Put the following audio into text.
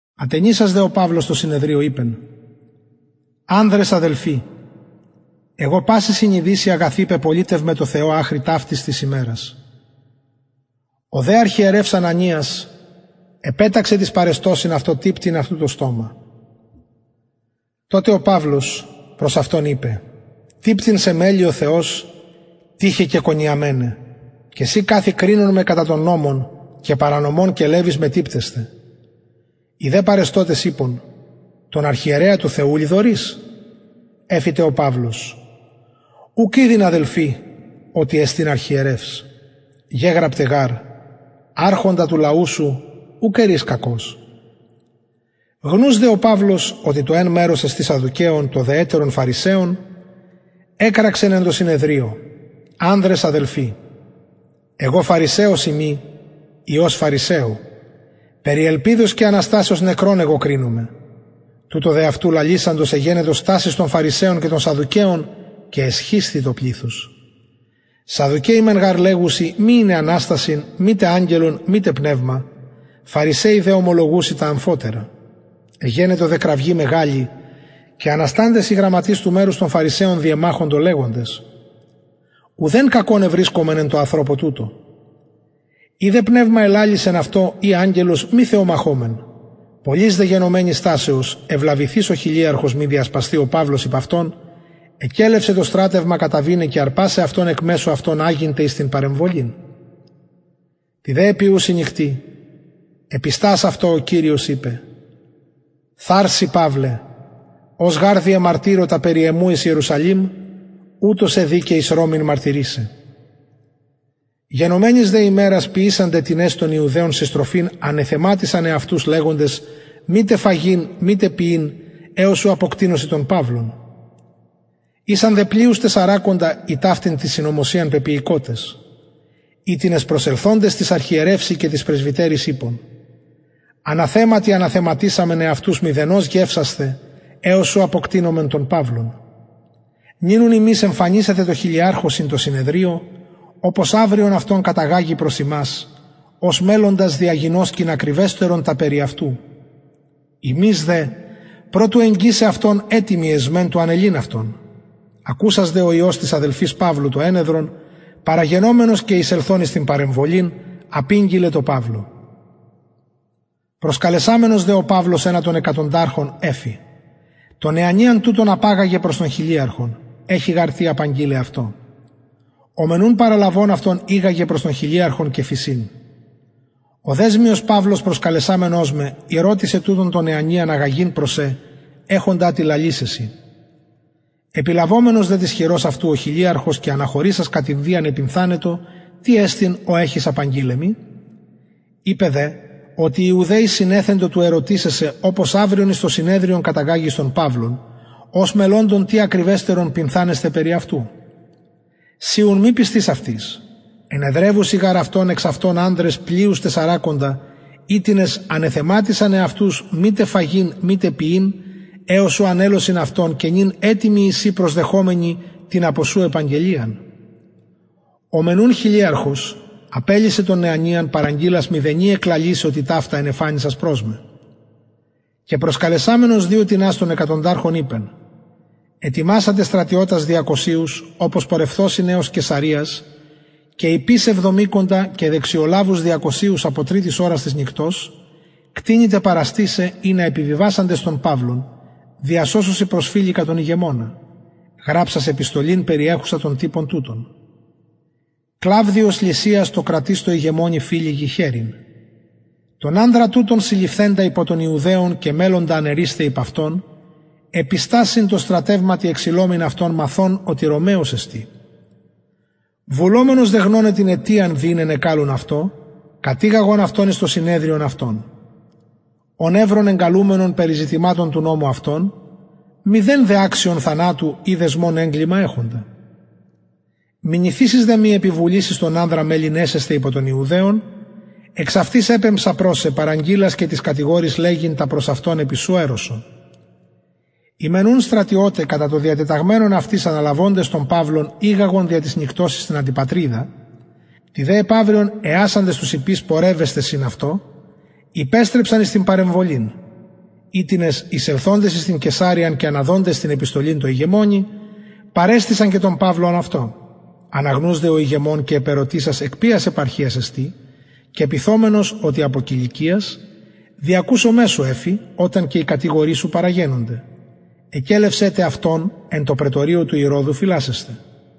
ατενισας δε ο παυλος τω συνεδριω ειπεν ανδρες αδελφοι εγω παση συνειδησει αγαθη πεπολιτευμαι τω θεω αχρι ταυτης της ημερας ο δε αρχιερευς ανανιας επεταξεν τοις παρεστωσιν αυτω τυπτειν αυτου το στομα τοτε ο παυλος προς αυτον ειπεν τυπτειν σε μελλει ο θεος τοιχε κεκονιαμενε και συ καθη κρινων με κατα τον νομον και παρανομων κελευεις με τυπτεσθαι οι δε παρεστωτες ειπον τον αρχιερεα του θεου λοιδορεις εφη τε ο παυλος ουκ ηδειν αδελφοι οτι εστιν αρχιερευς γεγραπται γαρ αρχοντα του λαου σου ουκ ερεις κακως γνους δε ο παυλος οτι το εν μερος εστιν σαδδουκαιων το δε ετερον φαρισαιων εκραξεν εν τω συνεδριω ανδρες αδελφοι εγω φαρισαιος ειμι υιος φαρισαιου περι ελπιδος και αναστασεως νεκρων εγω κρινομαι τουτο δε αυτου λαλησαντος εγενετο στασις των φαρισαιων και εσχισθη το πληθος σαδδουκαιοι μεν γαρ λεγουσιν μη ειναι αναστασιν μηδε αγγελον μητε πνευμα φαρισαιοι δε ομολογουσιν τα αμφοτερα εγενετο δε κραυγη μεγαλη και ανασταντες οι γραμματεις του μερους των φαρισαιων διεμαχοντο λεγοντες ουδεν κακον ευρισκομεν εν τω ανθρωπω τουτω ει δε πνευμα ελαλησεν αυτω η αγγελος μη θεομαχωμεν πολλης δε γενομενης στασεως ευλαβηθεις ο χιλιαρχος μη διασπασθη ο παυλος υπ αυτων εκελευσεν το στρατευμα καταβηναι και αρπασαι αυτον εκ μεσου αυτων αγειν τε εις την παρεμβολην τη δε επιουση νυκτι επιστας αυτω ο κυριος ειπεν θαρσει παυλε ως γαρ διεμαρτυρω τα περι εμου εις ιερουσαλημ ουτως σε δει και εις ρωμην μαρτυρησαι γενομενης δε ημερας ποιησαντες τινες των ιουδαιων συστροφην ανεθεματισαν εαυτους λεγοντες μητε φαγειν μητε πιειν εως ου αποκτεινωσιν τον παυλον ησαν δε πλειους τεσσαρακοντα οι ταυτην την συνωμοσιαν πεποιηκοτες οιτινες προσελθοντες τοις αρχιερευσιν και τοις πρεσβυτεροις ειπον αναθεματι ανεθεματισαμεν εαυτους μηδενος γευσασθαι εως ου αποκτεινωμεν τον παυλον νυν ουν υμεις εμφανισατε τω χιλιαρχω συν τω συνεδριω οπως αυριον αυτον καταγαγη προς υμας ως μελλοντας διαγινωσκειν ακριβεστερον τα περι αυτου ημεις δε προ του εγγισαι αυτον ετοιμοι εσμεν του ανελειν αυτον ακουσας δε ο υιος της αδελφης παυλου το ενεδρον παραγενομενος και εισελθων εις την παρεμβολην απηγγειλεν τω παυλω προσκαλεσαμενος δε ο παυλος ενα των εκατονταρχων εφη τον νεανιαν τουτον απαγαγε προς τον χιλιαρχον εχει γαρ τι απαγγειλαι αυτω ο μεν ουν παραλαβων αυτον ηγαγεν προς τον χιλιαρχον και φησιν ο δεσμιος παυλος προσκαλεσαμενος με ηρωτησεν τουτον τον νεανιαν αγαγειν προς σε εχοντα τι λαλησαι σοι επιλαβομενος δε της χειρος αυτου ο χιλιαρχος και αναχωρησας κατ ιδιαν επυνθανετο τι εστιν ο εχεις απαγγειλαι μοι ειπεν δε οτι οι ιουδαιοι συνεθεντο του ερωτησαι σε οπως αυριον εις το συνεδριον καταγαγης τον παυλον ως μελλοντα τι ακριβεστερον πυνθανεσθαι περι αυτου συ ουν μη πεισθης αυτοις ενεδρευουσιν γαρ αυτον εξ αυτων ανδρες πλειους τεσσαρακοντα οιτινες ανεθεματισαν εαυτους μητε φαγειν μητε πιειν εως ου ανελωσιν αυτον και νυν ετοιμοι εισιν προσδεχομενοι την απο σου επαγγελιαν ο μεν ουν χιλιαρχος απελυσεν τον νεανιαν παραγγειλας μηδενι εκλαλησαι οτι ταυτα ενεφανισας προς με και προσκαλεσαμενος δυο τινας των εκατονταρχων ειπεν ετοιμασατε στρατιωτας διακοσιους οπως πορευθωσιν εως καισαρειας και ιππεις εβδομηκοντα και δεξιολαβους διακοσιους απο τριτης ωρας της νυκτος κτηνη τε παραστησαι ινα επιβιβασαντες τον παυλον διασωσωσιν προς φηλικα τον ηγεμονα γραψας επιστολην περιεχουσαν τον τυπον τουτον κλαυδιος λυσιας τω κρατιστω ηγεμονι φηλικι χαιρειν τον ανδρα τουτον συλληφθεντα υπο των ιουδαιων και μελλοντα αναιρεισθαι υπ αυτων επιστας συν τω στρατευματι εξειλομην αυτον μαθων οτι ρωμαιος εστιν βουλομενος δε γνωναι την αιτιαν δι ην ενεκαλουν αυτω κατηγαγον αυτον εις το συνεδριον αυτων ον ευρον εγκαλουμενον περι ζητηματων του νομου αυτων μηδεν αξιον θανατου η δεσμων εγκλημα εχοντα μηνυθεισης δε μοι επιβουλης εις τον ανδρα μελλειν εσεσθαι υπο των ιουδαιων εξαυτης επεμψα προς σε παραγγειλας και τοις κατηγοροις λεγειν τα προς αυτον επι σου ερρωσο οι μεν ουν στρατιωται κατα το διατεταγμενον αυτοις αναλαβοντες τον παυλον ηγαγον δια της νυκτος εις την αντιπατριδα τη δε επαυριον εασαντες τους ιππεις πορευεσθαι συν αυτω υπεστρεψαν εις την παρεμβολην οιτινες εισελθοντες εις την καισαρειαν και αναδοντες την επιστολην τω ηγεμονι παρεστησαν και τον παυλον αυτω αναγνους δε ο ηγεμων και επερωτησας εκ ποιας επαρχιας εστιν και πυθομενος οτι απο κιλικιας διακουσομαι σου εφη οταν και οι κατηγοροι σου παραγενωνται εκελευσεν τε αυτον εν τω πραιτωριω ηρωδου φυλασσεσθαι